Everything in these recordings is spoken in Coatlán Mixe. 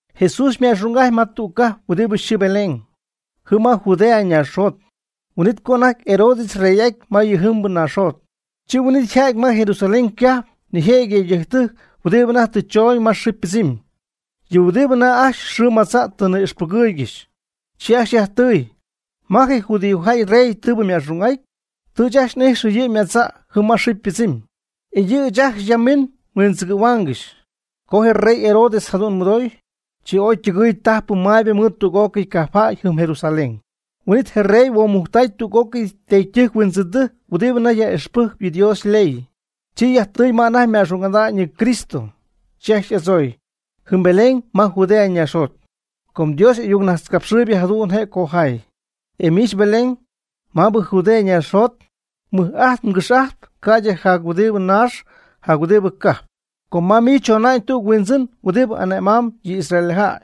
Jesús yma'xung'ajty ma tüg cajp huɨdi yxɨɨ Belén, jɨm ma Judea ñaaxjot, huin'it co anajty Herodes yrey'aty ma yɨ jɨmbɨ naaxjot. Chi huin'it yja'ty ma Jerusalén cajp nijëjɨty yëydɨjctɨjc huidibɨ anajty tɨ choñ ma xɨɨ ypɨdzɨmy, yɨ huɨdibɨ anajty ajcxy xɨɨ madza' tɨ ni'ixpɨgɨɨygɨxy. Chi ajcxy yajtɨy: ―¿Ma je judíojäy yrey tɨɨbɨ yma'xung'aty? Tɨ ɨɨch ajcxy n'ijxɨ yɨ' ymadza' jɨm ma xɨɨ ypɨdzɨmy, e yɨ' ɨɨch ajcxy ya miñ nhuindzɨgɨ̈huaangɨxy. Co je rey Herodes jadu'n mɨdooy, chi ooy ytɨgɨɨy tajpɨ maybɨ mɨɨd tüg'ócɨy cajpjäy jɨm Jerusalén. Huin'it je rey huomujctay tüg'ócɨy teedytɨjc huindzɨndɨjc huɨdibɨ anajty yaj'ixpɨjcp yɨ Dios yley, chi yajtɨy ma anajty yma'xung'ada'ñ yɨ Cristo. Chi ajcxy y'adzooy: ―Jɨm Belén ma Judea ñaaxjot, com Dios y'ayucnajtzcapxɨɨybɨ jadu'n je' cojaay: E miich Belén, mabɨ Judea ñaaxjot, mɨj'ajtp mgɨx'ajtp ca'ydɨ jac huɨdi naax jac huɨdi cajp, com ma miich chona'ñ tüg Huindzɨn huɨdi ane' mam yɨ israeljäy.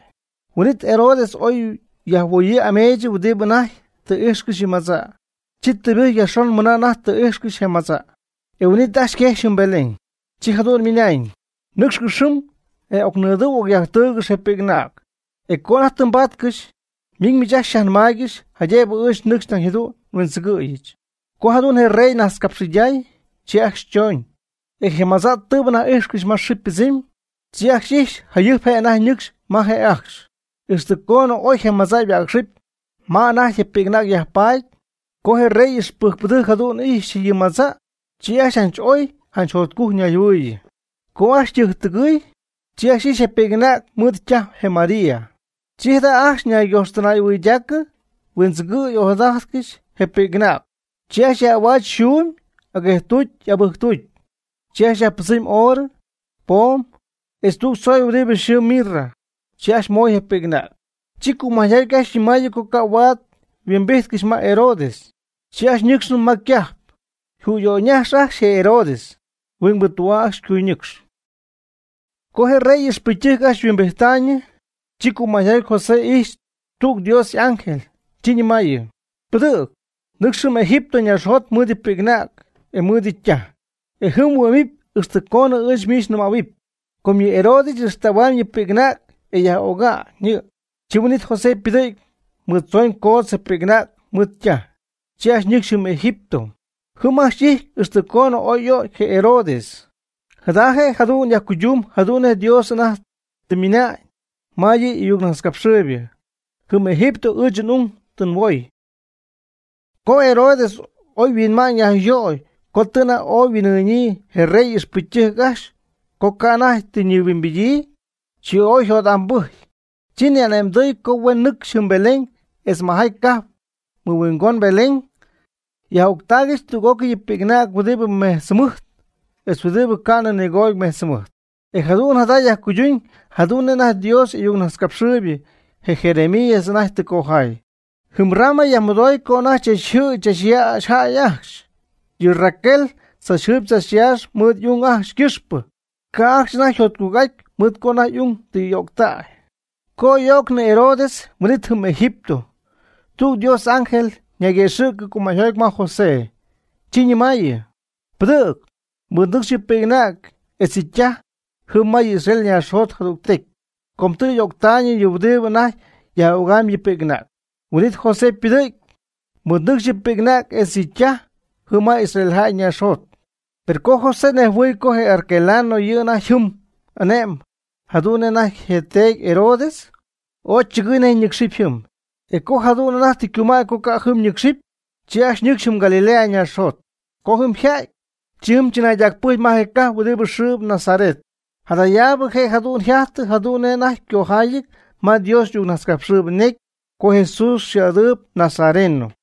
Huin'it Herodes oy yajhuoyii ameech huɨdibɨ anajty tɨ íjxcɨxy yɨ madza'. Chi tɨybɨjcy yajxon mɨna anajty oga'n tɨ ijxcɨxy je madza'. E huin'it ajcxy quejxy jɨm Belén. Chi jadu'n nɨmay: ―Nɨ́cxcɨx jɨm e ocnidɨu ocyajtɨugɨxy je pi'c'anäg; e co anajty tɨ mbatcɨxy, miñ miich ajcxy xyajnɨmáaygɨxyɨch jaydëbɨ ɨɨch nɨcxy nañ jadu'n nhuindzɨgɨ̈yɨch. Co jadu'n rey najtzcapxɨyday, chi ajcxy choñ. E je madza' tɨɨbɨ anajty íjxcɨxy ma xɨɨ ypɨdzɨmy, chi ajcxy ijxy jayɨjp je' anajty ñɨcxy ma je' ajcxy, ixtɨ conɨ oy je madza' yhuäcxɨpy ma anajty je pi'c'anäg yajpaady. Co je rey ixpɨcytɨjc jadu'n ijxy yɨ madza', chi ajcxy oy janch jotcujc ñayjɨhuɨ̈yii. Co ajcxy ytɨjctɨgɨɨy, chi ajcxy ijxy je pi'c'anäg mɨɨd ytaj je María. Chi jada' ajcxy ñaygojxtɨnaydaacɨ huindzɨgɨɨy ojadajty ajcxy je pi'c'anäg. Chi ajcxy yaj'ahuach yxuumy aguejtucy abɨjctucy, chi ajcxy yajpɨdzɨmy oorɨ, poom, etz tüg tzoy huɨdi yxɨɨ mirra. Chi ajcxy moy je pi'c'anäg. Chi cumäyjoty ajcxy nɨmaayɨ co ca' huaad yhuimbijtcɨxy ma Herodes, chi ajcxy ñɨcxnɨ ma ycajp, jüyöyñaxy ajcxy je Herodes, huingbɨ tü'aa ajcxy ycuyñɨcx. Co je rey ixpɨcytɨjc ajcxy yhuimbijttaayñɨ, chi cumäjoty José ijxy tüg Dios y'ángel, chi ñɨmaayɨ: ―Pɨdɨ̈g, nɨcx jɨm Egipto ñaaxjot mɨɨd yɨ pi'c'anäg etz mɨɨd yɨ' ytaj, e jɨm mhuɨ'mɨpy ixtɨ coonɨ ɨɨch miich nɨmähuɨpy. Com yɨ Herodes y'ixtähuamy yɨ' yɨ pi'c'anäg e yaj'öga'ñ yɨ'. Chi huin'it José ypɨdɨ̈gy mɨɨd tzooñ coodz je pi'c'anäg mɨɨd ytaj, chi ajcxy ñɨcxy jɨm Egipto. Jɨm ajcxy y'ijty ixtɨ coonɨ oy y'ögy je Herodes. Jada je' jadu'n yajcuydun jadu'n nej Dios anajty tɨ ymɨnañ ma yɨ' y'ayucnajtzcapxɨɨybɨ: “Jɨm Egipto ɨɨch n'ung tɨ nhuoy.” Co Herodes oy huinma'ñ yajyöy co tɨ anajty ooy yhuin'ɨɨñyii je rey ixpɨcytɨjc ajcxy co ca' anajty tɨ ñihuimbidyii, chi ooy yjot'ambɨjcy, chi ni'ane'mdɨɨy co huen nɨcxy jɨm Belén etz majaty cajp mɨhuingon Belén, yaj'öctaaygɨxy tüg'ócɨy yɨ pi'c'anäg huɨdibɨ mejtz jɨmɨjt etz huɨdibɨ ca'nɨ nigooty mejtz jɨmɨjt. E jadu'n jada yajcuyduñ jadu'n nej anajty Dios y'ayucnajtzcapxɨɨybɨ, je Jeremías, anajty tɨ cojaay: Jɨm Ramá yajmɨdoy co anajty chachjɨɨy chachyäxy jäy ajcxy; yɨ Raquel tzachjɨɨyb tzachyaaxp mɨɨd y'ung ajcxy ycɨxpɨ, ca' ajcxy anajty yjotcujc'aty mɨɨd co anajty y'ung tɨ y'öctäy. Co oy y'öcnɨ Herodes huin'it jɨm Egipto, Dios tüg y'ángel ñayguëxɨ̈cɨ cumäyjoty ma José. Chi ñɨmayɨ: ―Pɨdɨ̈g, mɨɨdnɨcx yɨ pi'c'anäg etz yɨ' ytaj jɨm ma yɨ Israel ñaaxjot jadügtecy com tɨ y'öctaayñɨ yɨ huɨdibɨ anajty yaj'ögam yɨ pi'c'anäg. Huin'it José ypɨdɨ̈gy, mɨɨd nɨcxy yɨ pi'c'anäg etz yɨ' ytaj jɨm ma Israel ñaaxjot. Per co José nejhuɨɨy co je Arquelao yɨ' anajty jɨm ane'mb jadu'n nej anajty je yteedy Herodes, ooy chɨgɨɨy nej ñɨcxɨp jɨm. E co jadu'n anajty tɨ ycumäy co ca' jɨm ñɨcxɨp, chi ajcxy ñɨcxy jɨm Galilea ñaaxjot. Co jɨm yjäty, chi jɨm chɨnaydacpɨjcy ma je cajp huɨdi yxɨɨ Nazaret. Jadayaabɨ je' jadu'n tun jajtɨ jadu'n nej anajty ycojaayɨty ma Dios y'ayucnajtzcapxɨɨybɨ ñecy co Jesús xɨɨ'adɨɨyb Nazareno.